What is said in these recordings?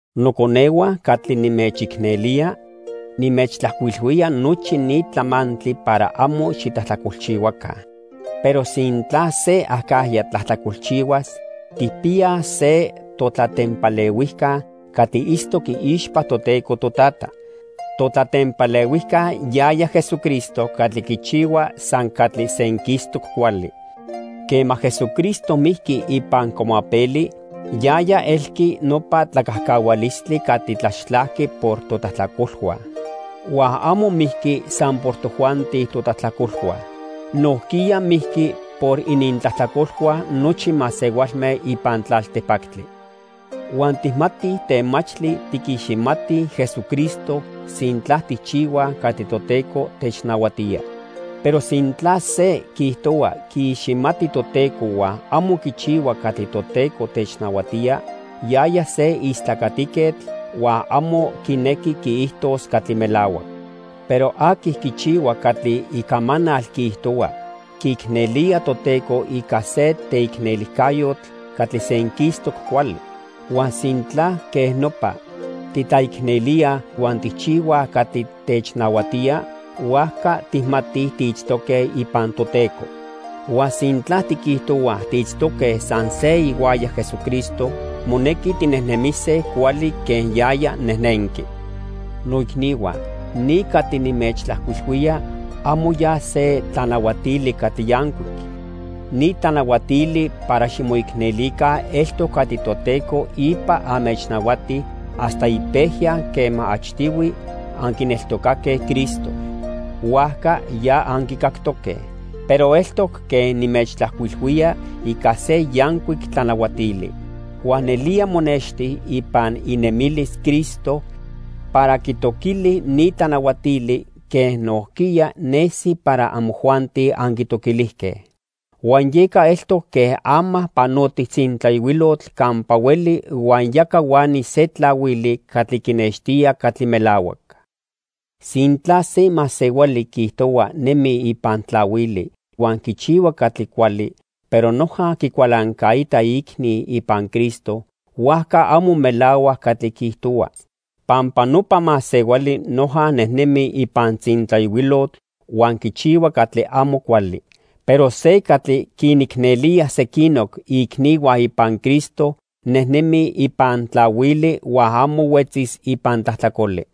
Noconehua catli nimechicnelía, nimechtlajcuilhuía nochi ni tlamantli para amo xitlajtlacolchihuaca. Pero sintla se acajya tlajtlacolchihuas, tijpiyaj se totlatempalehuijca catli itztoc iixpa Toteco Totata. Totlatempalehuijca yaya Jesucristo catli quichihua san catli senquistoc cuali. Quema Jesucristo mijqui ipan cuamapeli, yaya elqui nopa tlacajcahualistli catli tlaxtlajqui por totlajtlacolhua. Huan amo mijqui san por tojuanti totlajtlacolhua. Nojquiya mijqui por inintlajtlacolhua nochi masehualme ipan tlaltipactli. Huan tijmatij temachtli tiquiximatij Jesucristo, sintla tijchihuaj catli Toteco technahuatía. Pero sintla se quiijtohua quiiximati Toteco huan amo quichihua catli Toteco technahuatía, yaya se istlacatiquetl huan amo quinequi quiijtos catli melahuac. Pero aqui quichihua catli icamanal quiijtohua, quiicnelía Toteco ica se teicnelijcayotl catli senquistoc cuali. Huan sintla quej nopa titlaicnelíaj huan tijchihuaj catli technahuatía, huajca tijmatij tiitztoque ipan Toteco. Huan sintla tiquijtohuaj tiitztoque san se ihuaya Jesucristo, monequi tinejnemise cuali quen yaya nejnenqui. Noicnihua, ni catli nimechtlajcuilhuía amo ya se tlanahuatili catli yancuic. Ni tlanahuatili para ximoicnelica eltoc catli Toteco ipa anmechnahuati hasta ipejya quema achtihui anquineltocaque Cristo. Huajca ya anquicactoque. Pero eltoc quen nimechtlajcuilhuía ica se yancuic tlanahuatili. Huan nelía monexti ipan inemilis Cristo para quitoquili ni tlanahuatili quen nojquiya nesi para amojuanti anquitoquilijque. Huan yeca eltoc quen ama panotij tzintlayohuilotl campa hueli huan ya cahuani se tlahuili catli quinextía catli melahuac. Sintla se masehuali quiijtohua nemi ipan tlahuili huan quichihua catli cuali, pero noja quicualancaita iicni ipan Cristo, huajca amo melahuac catli quiijtohua. Pampa nopa masehuali noja nejnemi ipan tzintlayohuilotl huan quichihua catli amo cuali. Pero se catli quinicnelía sequinoc iicnihua ipan Cristo, nejnemi ipan tlahuili huan amo huetzis ipan tlajtlacoli.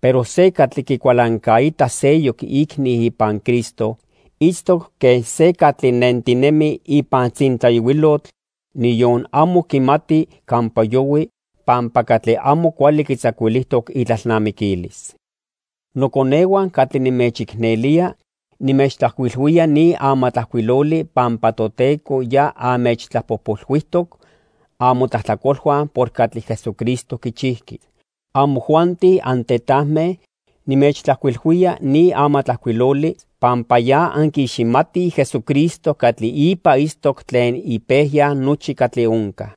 Pero se catli quicualancaita seyoc iicni ipan Cristo, itztoc quen se catli nentinemi ipan tzintlayohuilotl, niyon amo quimati campa yohui pampa catli amo cuali quitzacuilijtoc itlalnamiquilis. Noconehua catli nimechicnelía, nimechtlajcuilhuía ni amatlajcuiloli pampa Toteco ya anmechtlapojpolhuijtoc amotlajtlacolhua por catli Jesucristo quichijqui. Amojuanti antetajme, nimechtlajcuilhuía ni amatlajcuiloli pampa ya anquiiximatij Jesucristo catli ipa itztoc tlen ipejya nochi catli onca.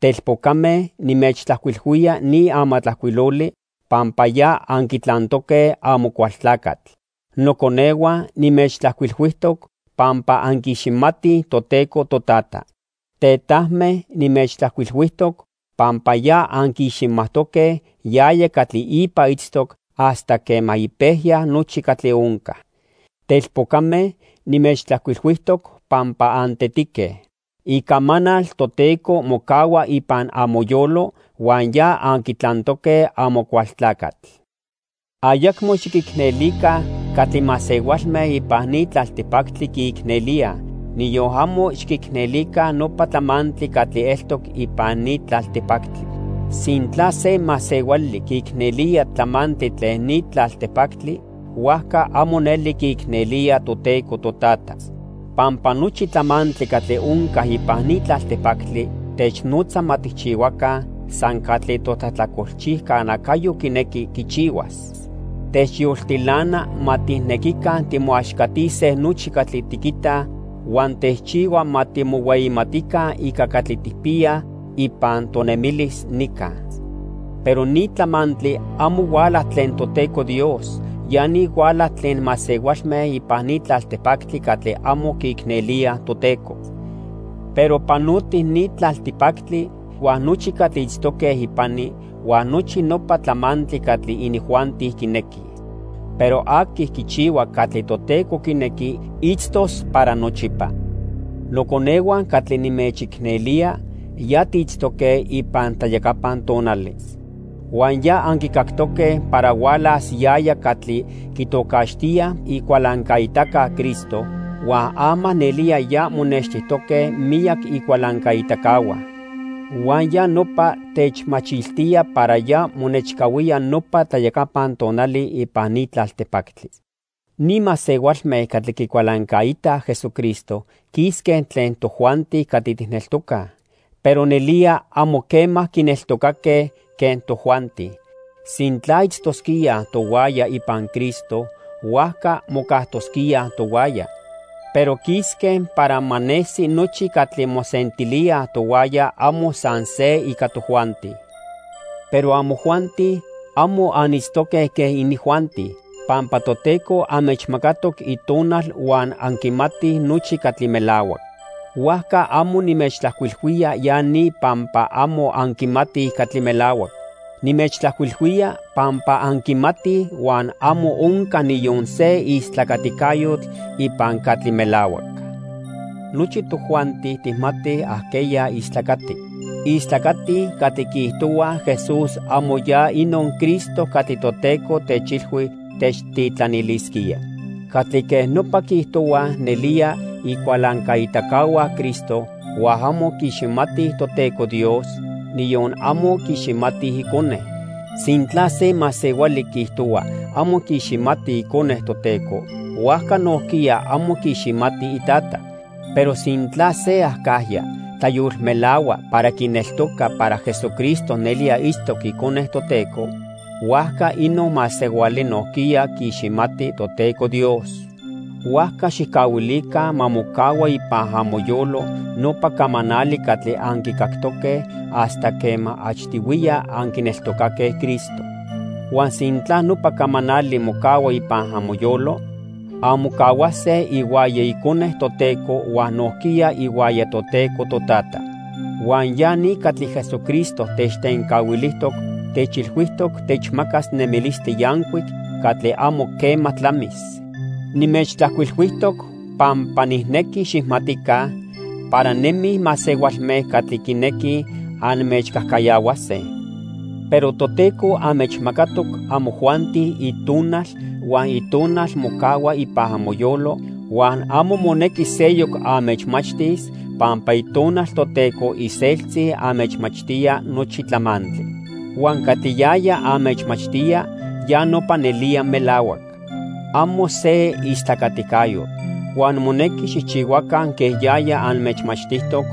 Telpocame, nimechtlajcuilhuía ni amatlajcuiloli pampa ya anquitlantoque Amocualtlacatl. Noconehua, nimechtlajcuilhuijtoc pampa anquiiximatij Toteco Totata. Tetajme, nimechtlajcuilhuijtoc pampa ya anquiiximajtoque yaya catli ipa itztoc hasta quema ipejya nochi catli onca. Telpocame, nimechtlajcuilhuijtoc pampa antetique. Icamanal Toteco mocahua ipan amoyolo huan ya anquitlantoque Amocualtlacatl. Ayacmo xiquicnelica catli masehualme ipan ni tlaltipactli quiicnelíaj, niyon amo xiquicnelica nopa tlamantli catli eltoc ipan ni tlaltipactli. Sintla se masehuali quiicnelía tlamantli tlen ni tlaltipactli, huajca amo neli quiicnelía Toteco Totata. Pampa nochi tlamantli catli onca ipan ni tlaltipactli technotza ma tijchihuaca san catli totlajtlacolchijca nacayo quinequi quichihuas. Techyoltilana ma tijnequica timoaxcatise nochi catli tiquitaj, huan techchihua ma timohueyimatica ica catli tijpiyaj ipan tonemilis nica. Pero ni tlamantli amo huala tlen Toteco Dios, ya ni huala tlen masehualme ipan ni tlaltipactli catli amo quiicnelíaj Toteco. Pero panoti ni tlaltipactli huan nochi catli itztoque ipani, huan nochi nopa tlamantli catli inijuanti quinequij. Pero aqui quichihua catli Toteco quinequi, itztos para nochipa. Noconehua catli nimechicnelía, ya tiitztoque ipan tlayacapan tonali. Huan ya anquicactoque para hualas yaya catli quitocaxtíaj Icualancaitaca Cristo, huan ama nelía ya monextijtoque miyac icualancaitacahua. Huan ya nopa techmachiltía para ya monechcahuía nopa tlayacapan tonali ipan ni tlaltipactli. Ni masehualme catli quicualancaitaj Jesucristo quisque tlen tojuanti catli tijneltocaj, pero nelía amo quema quineltocaque quen tojuanti. Sintla itztosquíaj tohuaya ipan Cristo, huajca mocajtosquíaj tohuaya, pero quisque para ma nesi nochi catli mosentilíaj tohuaya amo san se ica tojuanti. Pero amojuanti, amo anitztoque quen inijuanti, pampa Toteco anmechmacatoc Itonal huan anquimatij nochi catli melahuac. Huajca amo nimechtlajcuilhuía ya ni pampa amo anquimatij catli melahuac. Nimechtlajcuilhuía pampa anquimatij, huan amo onca niyon se istlacaticayotl ipan catli melahuac. Nochi tojuanti tijmatij ajqueya istlacati. Istlacatij catli quiijtohuaj Jesús amo ya inon Cristo catli Toteco techilhui techtitlanilisquía. Catli quej nopa quiijtohuaj nelía icualancaitacahua Cristo huan amo quiiximatij Toteco Dios, niyon amo quiiximatij Icone. Sintla se masehuali quiijtohua amo quiiximati Icone Toteco, huajca nojquiya amo quiiximati iTata. Pero sintla se acajya tlayolmelahua para quineltoca para Jesucristo nelía itztoc Icone Toteco, huajca inon masehuali nojquiya quiiximati Toteco Dios. Huajca xijcahuilica ma mocahua ipan amoyolo nopa camanali catli anquicactoque hasta quema achtihuiya anquineltocaque Cristo. Huan sintla nopa camanali mocahua ipan amoyolo, anmocahuase ihuaya Icone Toteco huan nojquiya ihuaya Toteco Totata. Huan ya ni catli Jesucristo techtencahuilijtoc; techilhuijtoc techmacas nemilistli yancuic catli amo quema tlamis. Nimechtlajcuilhuijtoc pampa nijnequi xijmatica para nemij masehualme catli quinequij anmechcajcayahuase. Pero Toteco anmechmacatoc amojuanti Itonal, huan Itonal mocahua ipan amoyolo huan amo monequi seyoc anmechmachtis pampa Itonal Toteco iseltzi anmechmachtía nochi tlamantli. Huan catli yaya anmechmachtía ya nopa nelía melahuac. Amo se istlacaticayotl. Huan monequi xijchihuaca quen yaya anmechmachtijtoc,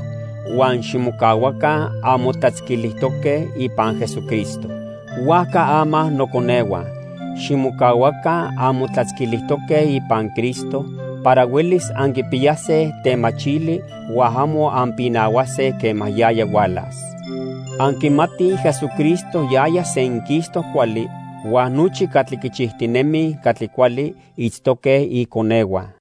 huan ximocahuaca anmotlatzquilijtoque ipan Jesucristo. Huajca ama noconehua, ximocahuaca anmotlatzquilijtoque ipan Cristo para huelis anquipiyase temachili huan amo anpinahuase quema yaya hualas. Anquimatij Jesucristo yaya senquistoc cuali, huan nochi catli quichijtinemij catli cuali itztoque iconehua.